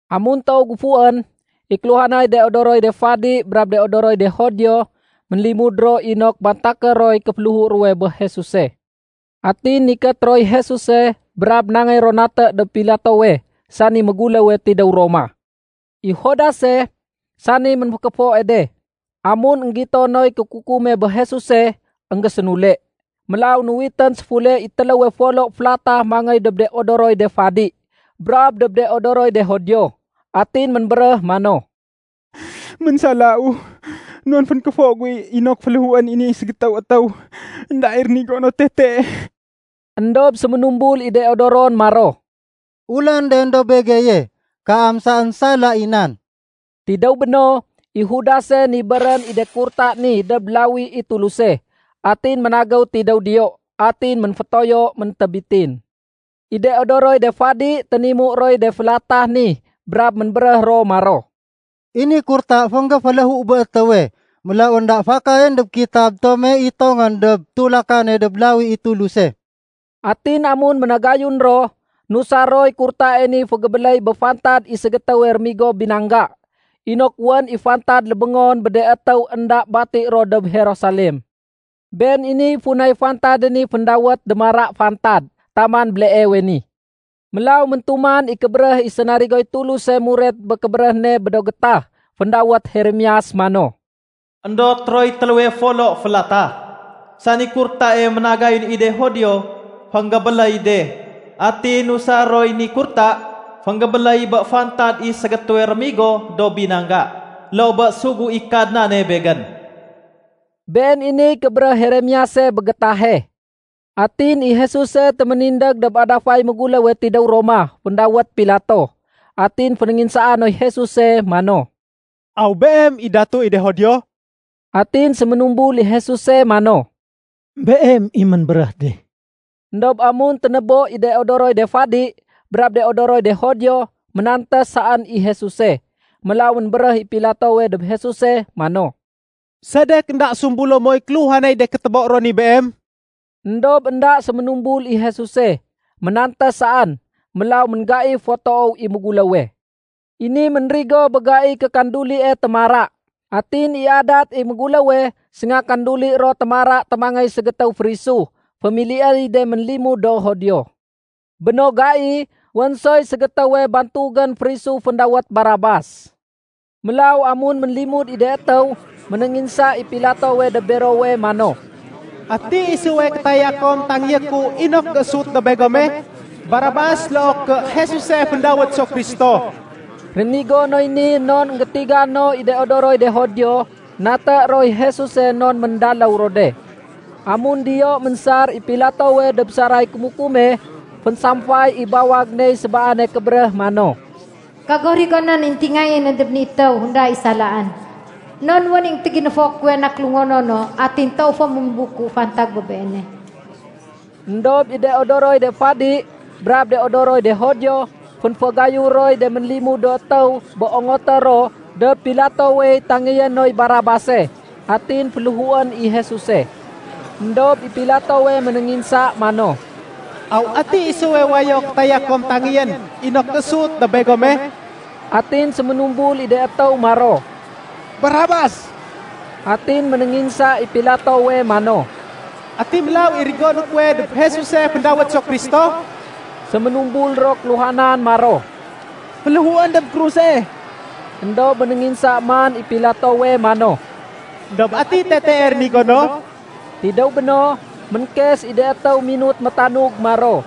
Amun toow géfuwén, i kéluhanay de odoroy de fadi brab de odoroy de Judio, ménlimud ro inok bantaké roy kéféléhu ruwe bé Jesuse. Atin nikét roy Jesuse brab nangéy ro naté dob Pilatowe sani méguléwe tidéw Roma. I Judase, sani ménfékéfoe de, amun énggito noy kékukume bé Jesuse, énggésénule. Mélaw nuwitén séfule i téléwe folo félatah mangéy dob de odoroy de fadi brab dob de odoroy de Judio. Atin ménbéréh mano, “Ménsalau non fénkéfo gu inok féléhuén i ni ségétéw étéw énda i rénigo no tete.” Endob séménumbul i de odoron maro, “Ulanden dob begeye. Kaam saén sala i nan.” Tidéw béno, i Judase nibérén i de kurta ni dob lawi i Tuluse, atin ménagéw tidéw diyo. Atin ménfétoyo méntébitin. I de odoroy de fadi ténimu roy de félatah ni brab ménbéréh ro maro, “I ni kurta fénggéféléhu bé étéwe, mélaw énda fakayén dob kitab tome itongén dob tulakane dob lawi i Tuluse.” Atin amun ménagayun ro, nusar roy kurtae ni fégébéléy bé fantad i ségétéwe rémigo binangga, inok wén i fantad lébéngon bé de étéw énda bati ro dob Jerusalem. Been i funay fantade ni féndawét “Démara Fantad” taman béleewe ni. Mélaw méntuman i kébéréh i sénarigoy Tuluse muret bé kébéréh ne bé do gétah féndawét Jeremias mano, “Endot roy téléwe folo félatah, sani kurtae ménagayun i de Judio fénggébéléy de. Atin nusar roy ni kurta fénggébéléy bé fantad i ségétéwe rémigo do binangga, loo bé sugu i Kadnane Begén.” Been i niy kébéréh Jeremiase bé gétahe. Atin i Jesuse téménindég dob adafay méguléwe tidéw Roma féndawét Pilato. Atin fénénginsaa noy Jesuse mano, “Aw Beem i Datu i de Judio?” Atin séménumbul i Jesuse mano, “Beem i ménbéréh de.” Endob amun ténébo i de odoroy de fadi brab de odoroy de Judio, ménantés saén i Jesuse. Mélaw ménbéréh i Pilatowe dob Jesuse mano, “Sedek énda sumbulo moy kéluhanay de kétobo ro ni Beem?” Endob énda séménumbul i Jesuse, ménantés saén. Mélaw ménggaif fo toow i méguléwe. I ni ménrigowe bé gaiy kékandulie Témara. Atin i adat i méguléwe, sénga kanduli ro Témara témangéy ségétéw férisu fémiliéy de ménlimud do Judio. Bé no gai, wén soy ségétéwe bantugén férisu féndawét Barabas. Mélaw amun ménlimud i de étéw, ménénginsa i Pilatowe dob berowe mano, “Ati isuwe kétaya kom tangéyé ku inok géésut dob begome? Barabas loo ké Jesuse féndawét so Kristo?” Rénigo noy ni non énggétiga no i de odoroy de Judio, naté roy Jesuse non méndaléw ro de. Amun diyo ménsar i Pilatowe dob saray kémukume, fénsamfay i bawag ney sébaane kébéréh mano, “Kago rigonén i éntingayéne dob ni étéw énda i salaén. Non wén i énggétéginéfo kuwe na kélungonono atin toowu fo ménbuku fantag bé Beene.” Endob i de odoroy de fadi brab de odoroy de Judio, fénfagayu roy de ménlimud do étéw bé ongoté ro dob Pilatowey tangéyé noy Barabase, atin féléhuén i Jesuse. Endob i Pilatowe ménénginsa mano, “Aw ati isuwe wayo kétaya kom tangéyén inok géésut dob begome?” Atin séménumbul i de étéw maro, “Barabas.” Atin ménénginsa i Pilatowe mano, “Ati mélaw i rigoné kuwe dob Jesuse féndawét so Kristo?” Séménumbul ro kéluhanan maro, “Féléhuén dob kruse!” Endob ménénginsa man i Pilatowe mano, “Endob ati tetee rénigo no?” Tidéw béno, ménkes i de étéw minut métanug maro,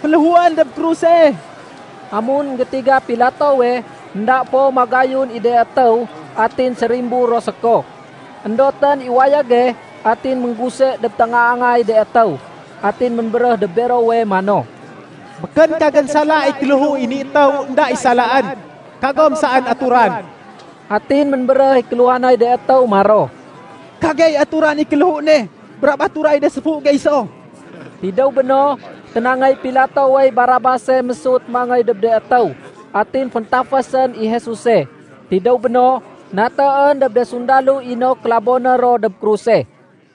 “Féléhuén dob kruse!” Amun énggétiga Pilatowe énda fo magayun i de étéw atin sérimbur ro séko, éndotén i wayége atin méngguse dob téngaangay de étéw. Atin ménbéréh dob berowe mano, “Békén kagén sala i kéléhu i ni étéw énda i salaén. Kagom saén aturan.” Atin ménbéréh i kéluhanay de étéw maro, “Kagey aturan i kéléhu ne brab aturay de séfu gey so.” Tidéw béno, ténangéy Pilatowey Barabase mésut mangéy dob de étéw. Atin féntafésén i Jesuse. Tidéw béno, natéén dob de sundalo inok kélabo ro dob kruse.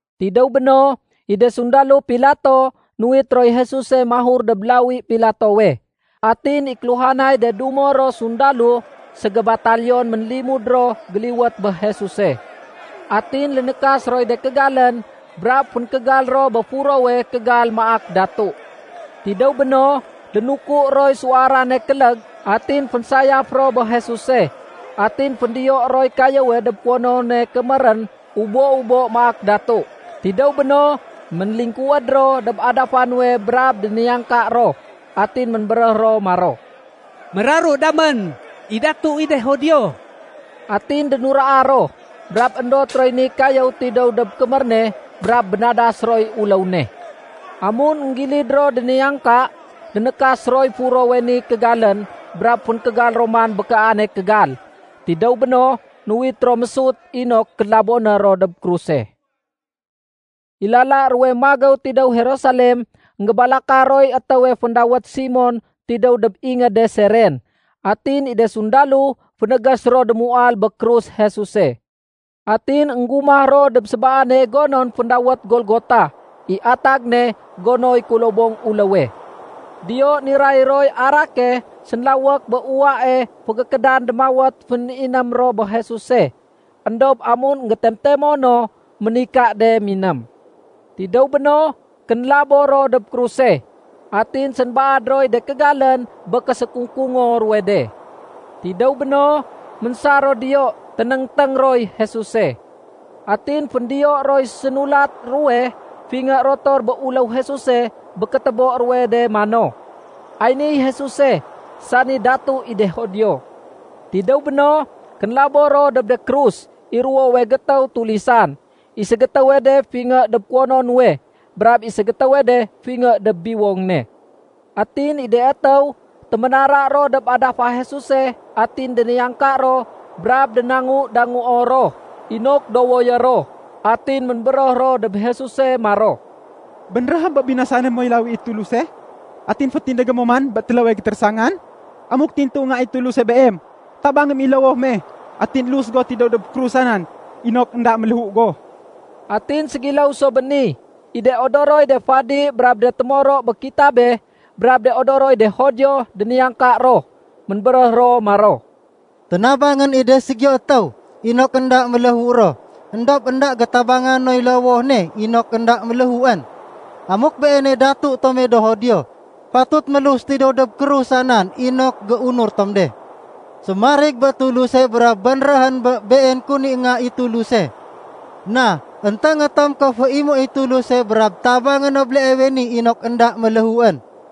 Tidéw béno, i de sundalo Pilato nuwit roy Jesuse mahur dob lawi Pilatowe. Atin i kéluhanay de dumo ro sundalo ségébataliyon ménlimud ro géliwét bé Jesuse. Atin lénékas roy de kégalén brab fénkégal ro bé furowe kégal maak datu. Tidéw béno, lénuku roy suwarane kélég atin fénsayaf ro bé Jesuse, atin féndiyo roy kayéwe dob kuwonone kémérén ubo-ubo maak datu. Tidéw béno, ménlingkuwéd ro dob adafa nuwe brab déniyangka ro. Atin ménbéréh ro maro, “Méraru damén i datu i de Judio.” Atin dénuraa ro, brab éndot roy ni kayéw tidéw dob kémér ne brab bénadas roy uléw ne. Amun énggilid ro déniyangka, lénékas roy furowe ni kégalén brab fénkégal ro man bé kaane kégal. Tidéw béno, nuwit ro mésut inok kélaboné ro dob kruse. I lala ruwe magéw tidéw Jerusalem, énggébalaka roy étéwe féndawét Simon tidéw dob ingéde Siren. Atin i de sundalo fénégés ro démuwal bé krus Jesuse. Atin énggumah ro dob sébaane gonon féndawét Golgota (i atag ne “gonoy kulobong uléwe.”) Diyo niray roy arake sénlawék bé uwae fégékédan démawét féniném ro bé Jesuse. Endob amun éngétemtemo no, ménika de miném. Tidéw béno, kénlabo ro dob kruse. Atin sénbaad roy de kégalén bé késékungkungo ruwe de. Tidéw béno, ménsar ro diyo ténéngténg roy Jesuse. Atin féndiyo roy sénulat ruwe fingé rotor bé uléw Jesuse bé kétébo ruwe de mano, “Ay niy Jesuse, sani datu i de Judio.” Tidéw béno, kénlabo ro dob de krus i ruwowe gétéw tulisan, i ségétéwe de fingé dob kuwono nuwe brab i ségétéwe de fingé dob biwong ne. Atin i de étéw, téménara ro dob adafa Jesuse atin déniyangka ro brab dénangu-danguo ro inok dowoyé ro. Atin ménbéréh ro dob Jesuse maro, “Bénréhém bé binasané moy lawi i Tuluse atin fétindégé mo man bé téléwe gétérésangan. Amuk tintu Nga i Tuluse Beem, tabangém i lowoh me atin lus go tidéw dob krusa nan inok énda méléhu go.” Atin ségiléw so bé ni, i de odoroy de fadi brab de témoro bé kitabe brab de odoroy de Judio déniyangka ro. Ménbéréh ro maro, “Ténabangén i de ségiyo étéw inok énda méléhu ro, éndob énda gétabanga noy lowoh ne inok énda méléhuén. Amuk Beeney datu tome do Judio, fatut mélus tidéw dob krusa nan inok géunur tom de. Sémarig bé Tuluse brab bénréhén bé Been kun i Nga i Tuluse. Na, énténgé tom ké féimuéy Tuluse brab tabangé no béleewe ni inok énda méléhuén.”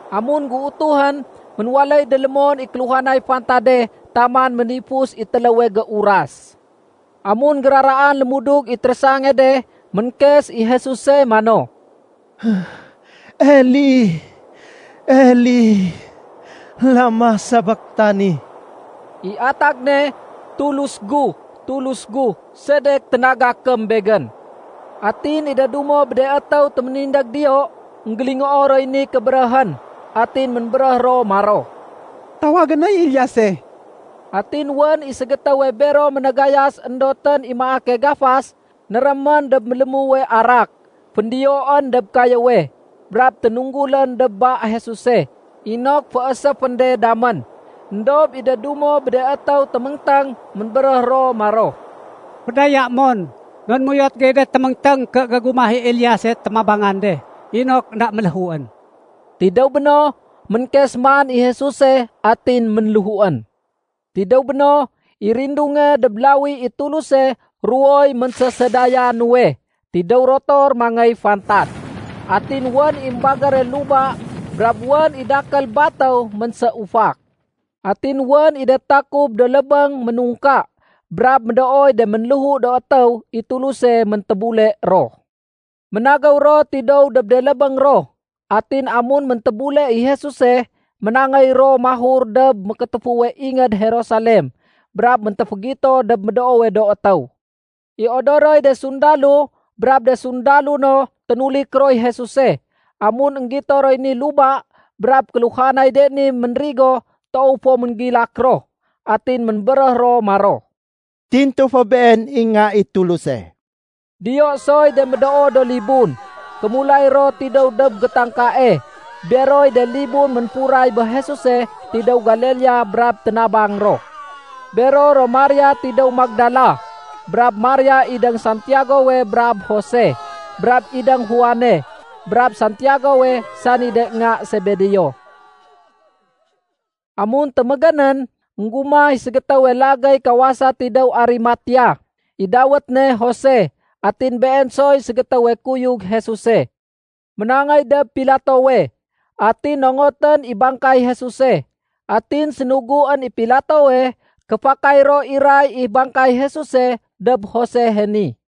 Amun géutuhén, ménwaléy délémon i kéluhanay fantade taman ménifus i téléwe géuras. Amun géraraan lémudug i térésange de, ménkes i Jesuse mano, “Eli, Eli, lama sabaktani?” I atag ne, “Tulus gu, Tulus gu, sedek ténagakém Begén?” Atin i de dumo bé de étéw témindég diyo, énggélingoo roy ni kébéréhén, atin ménbéréh ro maro, “Tawagé noy Eliase.” Atin wén i ségétéwe bero ménagayas éndotén i maake gafas, nérémén dob mélémuwe arak, féndiyoén dob kayéwe, brab ténunggulén dob ba Jesuse inok fééséfén de damén. Endob i de dumo bé de étéw téméngténg, ménbéréh ro maro, “Fédayaém mon, non méuyot gey de téméngténg ké gégumah i Eliase témabangan de inok énda méléhuén.” Tidéw béno, ménkes man i Jesuse atin ménléhuén. Tidéw béno, i rindunge dob lawi i Tuluse ruwoy ménsésédaya nuwe tidéw rotor mangéy fantad. Atin wén i émbagére luba brab wén i de dakél batéw ménséufak. Atin wén i de takub do lébéng ménungka brab médooy de ménléhu do étéw i Tuluse méntébule ro. Ménagéw ro tidéw dob de lébéng ro. Atin amun méntébule i Jesuse, ménangéy ro mahur dob mékétéfuwe ingéd Jerusalem brab méntéfégito dob médoowe do étéw. I odoroy de sundalo brab de sundalo no ténulik roy Jesuse, amun énggito roy ni luba brab kéluhanay de ni ménrigo, toow fo ménggilak ro. Atin ménbéréh ro maro, “Tintu fo Been i Nga i Tuluse.” Diyo soy de médoo do libun, kémulay ro tidéw dob gétangkae. Beroy de libun ménfuray bé Jesuse tidéw Galilea brab ténabang ro. Bero ro Maria tidéw Magdala, brab Maria idéng Santiagowe brab Jose, brab idéng Juane brab Santiagowe sani de nga Sebedeo. Amun témégénén, énggumah i ségétéwe lagéy kawasa tidéw Arimatea. I dawét ne Jose atin been soy ségétéwe kuyug Jesuse. Ménangéy dob Pilatowe, atin nongotén i bangkay Jesuse. Atin sénuguén i Pilatowe ké fakay ro iray i bangkay Jesuse dob Josehe ni.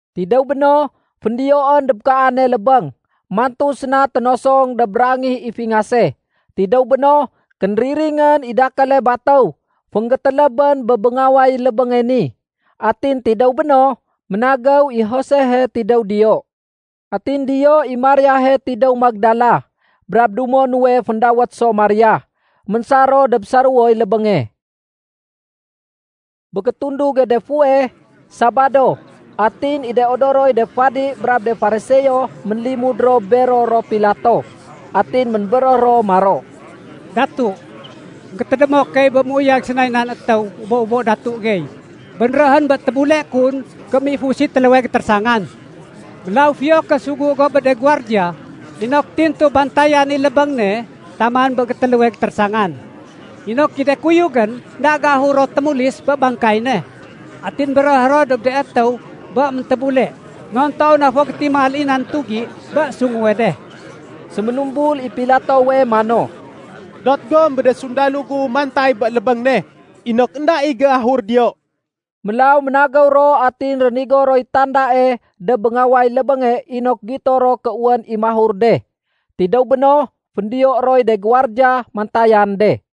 Tidéw béno, féndiyoén dob kaane lébéng, mantu séna ténosong dob rangih i fingase. Tidéw béno, kénriringén i dakéle batéw fénggétélébén bé béngaway lébénge ni. Atin tidéw béno, ménagéw i Josehe tidéw diyo. Atin diyo i Mariahe tidéw Magdala brab dumo nuwe féndawét so Maria. Ménsar ro dob saréwoy lébénge. Bé gétunduge de fuweh, Sabado. Atin i de odoroy de fadi brab de Fariseo ménlimud ro bero ro Pilato. Atin ménbéréh ro maro, “Datu, gétédémo key bé méuyag sénay nan étéw ubo-ubo datu gey, bénréhén bé tébule kun ké méifus i téléwe gétérésangan. Mélaw fiyo ké sugu go bé de guwardiya inok tintu bantayan i lébéng ne taman bé gétéléwe gétérésangan, inok i de kuyugén énda géahur ro témulis bé bangkay ne atin béréhé ro dob de étéw bé méntébule. Non toow na fo gétimal i nan tugi bé sunguwe de.” Séménumbul i Pilatowe mano, “Dot gom bé de sundalo gu mantay bé lébéng ne inok énda i géahur diyo.” Mélaw ménagéw ro atin rénigo roy tandae dob béngaway lébénge inok gito ro ké wén i mahur de. Tidéw béno, féndiyo roy de guwardiya mantayan de.